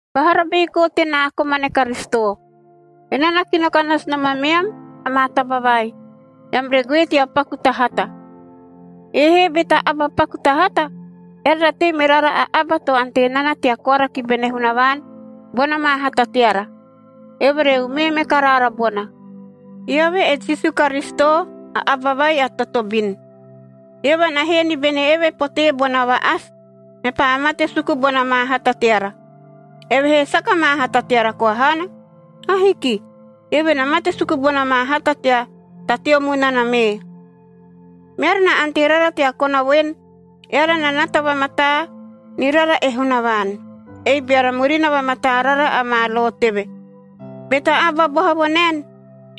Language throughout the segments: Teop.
Vahara baikoa tenaa komane Karisito, enaa na kino ka nasu nom ameam amaa taba vai, eam re goe tea paku ta hata. Ei he be ta aba paku ta hata, eara na tei me rara a aba to ante nana tea koara ki bene Hunavaan bona maa hata teara, eove re umee me ka raara bona. Eove e Jisu Karisito, a aba vai a totobin. Eove na hee ni bene eve potee bona va-asi, mepaa mate suku bona maa hata teara. Evehee saka maa hata teara koa haana. Ahiki. Eove na mate suku bona maa hata tea ta teo munana mee. Meara na ante rara tea kona voen, eara na nata vamataa ni rara e Hunavaan, ei beara murina vamataa rara amaa lo teve. Be ta aba boha vo naen,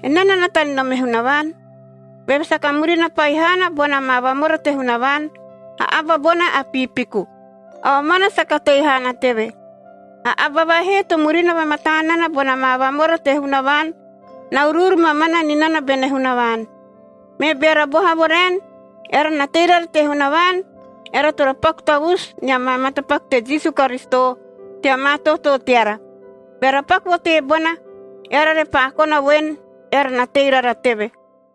“Enaa na nata ni nom e Hunavaan,” beve saka murina pahi haana bona maa vamora te Hunavaan, a aba bona a piipiku. A omana saka tei haana teve. A aba vai he to murina vamataa nana bona maa vamora te Hunavaan, na uruuru mamana ni nana bene Hunavaan. Me beara boha vo raen, eara na tei rara te Hunavaan, eara toro paku tavusu nia maa matapaku te Jisu Karisito tea maa tootoo teara. Beara paku vo teebona, eara repaa kona voen, eara na tei rara teve.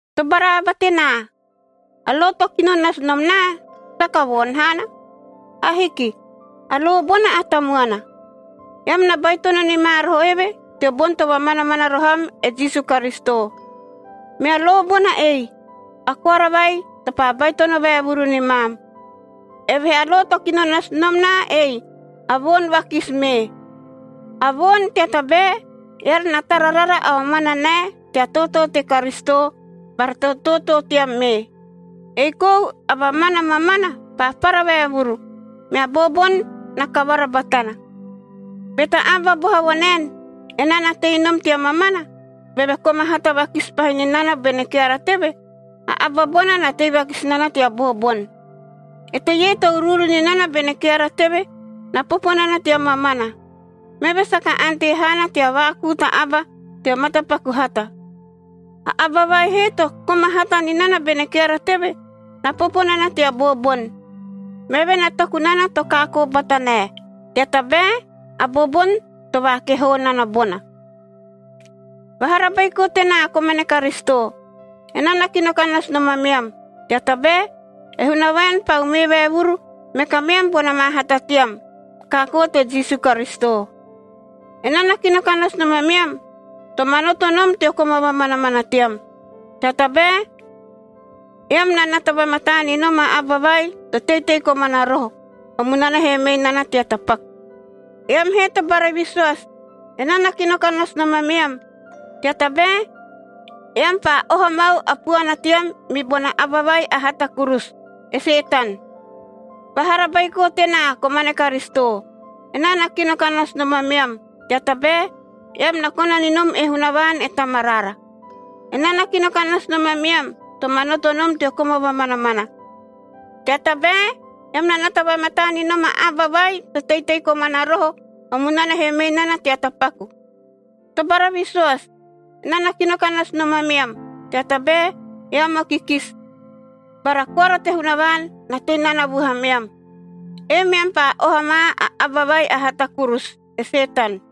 Tobara aba tenaa! A lo to kino nasu nom naa saka voon haana. Ahiki. A lo bona a tamuana. Eam na baitono ni ma roho eve teo boni to vamanamana roho am e Jisu Karisito. Mea lo bona ei, a koara vai to paa baitono vaevuru ni maam. Evehee a lo to kino nasu nom naa ei, a voon vakisi mee. A voon, tea tabae, eara na tara rara a omana nae tea tootoo te Karisito bara tea tootoo team mee. Ei kou a mamana mamana paa para vaevuru, mea booboni na kavara batana. Be ta aba boha vo naen, “Enaa na tei nom tea mamana,” beve koma hata vakisi pahi ni nana bene keara teve, a aba bona na tei vakisi nana tea booboni. Eteie to uruuru ni nana bene keara teve, na popo nana tea mamana. Meve saka ante haana tea vaakuu ta aba teo matapaku hata. A aba vai he to koma hata ni nana bene keara teve, na popo nana tea booboni. Meve na toku nana to kaakoo bata nae, tea tabae a booboni to vaakehoo nana bona. Vahara baiko tenaa komane Karisito! Enaa na kino ka nasu nom ameam, tea tabae e Hunavaan paa umee vaevuru me kameam bona maa hata team kaakoo te Jisu Karisito. Enaa na kino ka nasu nom ameam, to manoto nom teo koma vamanamana team,b tea tabae eam na nata vamataa ni nom a aba vai to teitei komana roho, o munana he mei nana tea tapaku. Eam he tobara visoasi, enaa na kino ka nasu nom ameam, tea tabae eam paa oha mau a puana team mi bona aba vai a hata kurusu, e Setan. Vahara baiko tenaa komane Karisito, enaa na kino ka nasu nom ameam, tea tabae, eam na kona ni nom e Hunavaan e Tamaraara. Enaa na kino ka nasu nom ameam, to manoto nom teo koma vamanamana, tea tabae eam na nata vamataa ni nom a aba vai to teitei komana roho, o munana he mei nana tea tapaku. Tobara visoasi, enaa na kino ka nasu nom ameam, tea tabae eam o kikisi bara koara te Hunavaan na tei nana vuhameam. Ei meam paa oha ma a aba vai a hata kurusu, e Setan.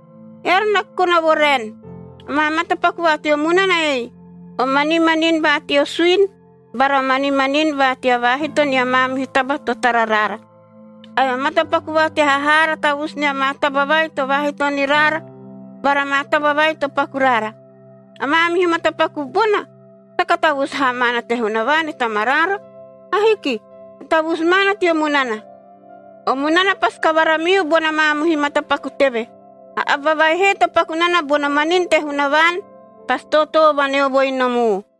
Eara na kona vo raen, amaa matapaku va teo munana ei: o manimanini va teo suini, bara o manimanini va tea vaahito nia maamihu taba to tara raara, ae o matapaku va tea hahaara tavusu nia maa taba vai to vaahito ni raara bara maa taba vai to paku raara. A maamihu matapaku bona saka tavusu haa maana te Hunavaan e Tamaraara. Ahiki. Na tavusu maana teo munana. O munana pasi kavara miu bona maamihu matapaku teve. A aba vai he to paku nana bono manini te Hunavaan pasi tootoo vaneovoi nom u.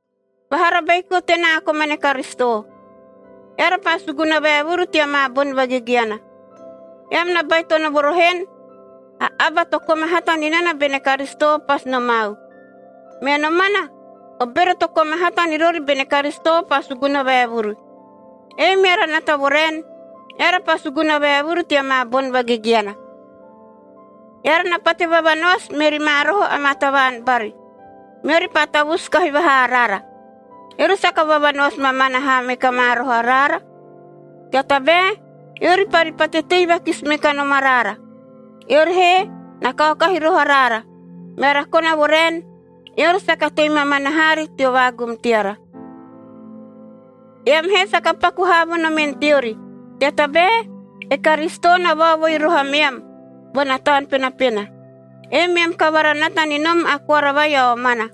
Vahara baiko tenaa komane Karisito, eara paa suguna vaevuru tea maa boni vagegeana. Eam na baitono vo roho en, “A aba to koma hata ni nana bene Karisitoc pasi nomau.” Me nomana o bero to koma hata ni rori bene Karisito paa suguna vaevuru. Ei meara nata vo raen, eara paa suguna vaevuru tea maa boni vagegeana. Eara na pate vavanoasi meri ma roho amaa tavaan bari, meori paa tavusu kahi vahaa araara. Eori saka vavanoasi mamana haa me ka ma roho araara, tea tabae eori pari pate tei vakisi me kanom araara. Eori he na kaokahi roho araara, meara kona vo raen, eori saka tei mamana haari teo vaagum teara. Eam he saka paku haa vo nomen teori, tea tabae e Karisito na vaovoi roho ameam bona Taun Penapena. Ei meam kavara nata ni nom a koara vai a omana.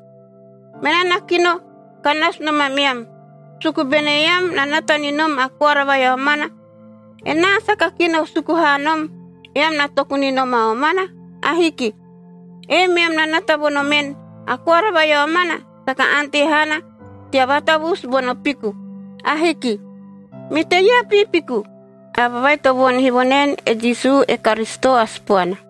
Menaa na kino ka nasu nom ameam, suku bene eam na nata ni nom a koara vai a omana. Enaa saka kino suku haa nom, eam na toku ni nom a omana. Ahiki. Ei meam na nata vo nomen, a koara vai a omana saka ante haana tea vaatavusu bono piku. Ahiki. Me eteie a piipiku? A aba vai to voonihi vo naen e Jisu e Karisito a Sipoana.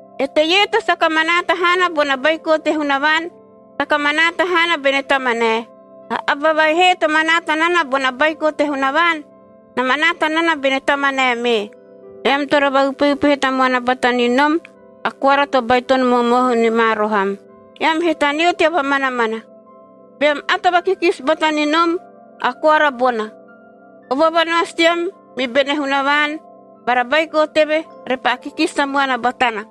Eteie to saka manaata haana bona Baiko te Hunavaan, saka manaata haana bene Tamanae. A aba vai he to manaata nana bona Baiko te Hunavaan, na manaata nana bene Tamanae mee. Eam toro vaupeupehe tamuana bata ni nom a koara to baitono momohu ni ma roho am, eam he taneo tea vamanamana. Beam ato vakikisi bata ni nom a koara bona, a vavanoasi team mi bene Hunavaan bara Baiko teve repaa kikisi tamuana batana.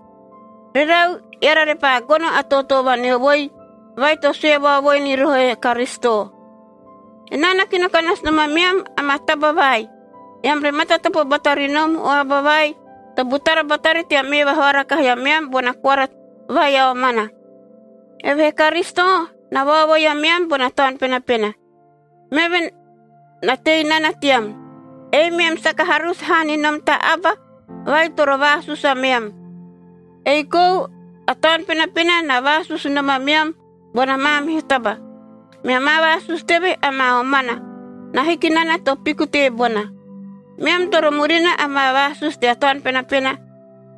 Rerau, eara repaa gono a tootoo vaneovoi vai to sue vaovoi ni roho e Karisito. Enaa na kino ka nasu nom ameam amaa taba vai, eam re matatopo bata ri nom o aba vai to butara batari tea mee vahoara kahi ameam bona koara vai a omana. Evehee Karisito na vaovoi ameam bona Taun Penapena, meve na tei nana team. Ei meam saka harusu haa ni nom ta aba vai toro vaasusu ameam. Ei kou a Taun Penapena na vaasusu nom ameam bona maamihu taba. Mea maa vaasusu teve amaa omana, na hiki nana to piku teebona. Meam toro murina amaa vaasusu tea Taun Penapena,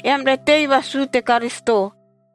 eam re tei vasuu te Karisito.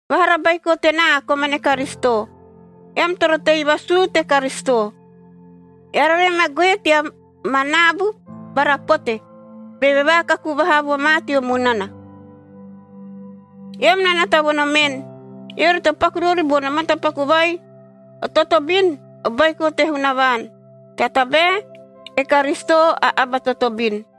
Vahara baiko tenaa komane Karisito! Eam toro tei vasuu te Karisito, eara re ma goe tea ma naabu bara pote, beve vaakaku vaha vo ma teo munana. Eam na nata vo nomen, eori to paku rori bono matapaku vai o totobin, o baiko te Hunavaan, tea tabae e Karisito a aba a totobin.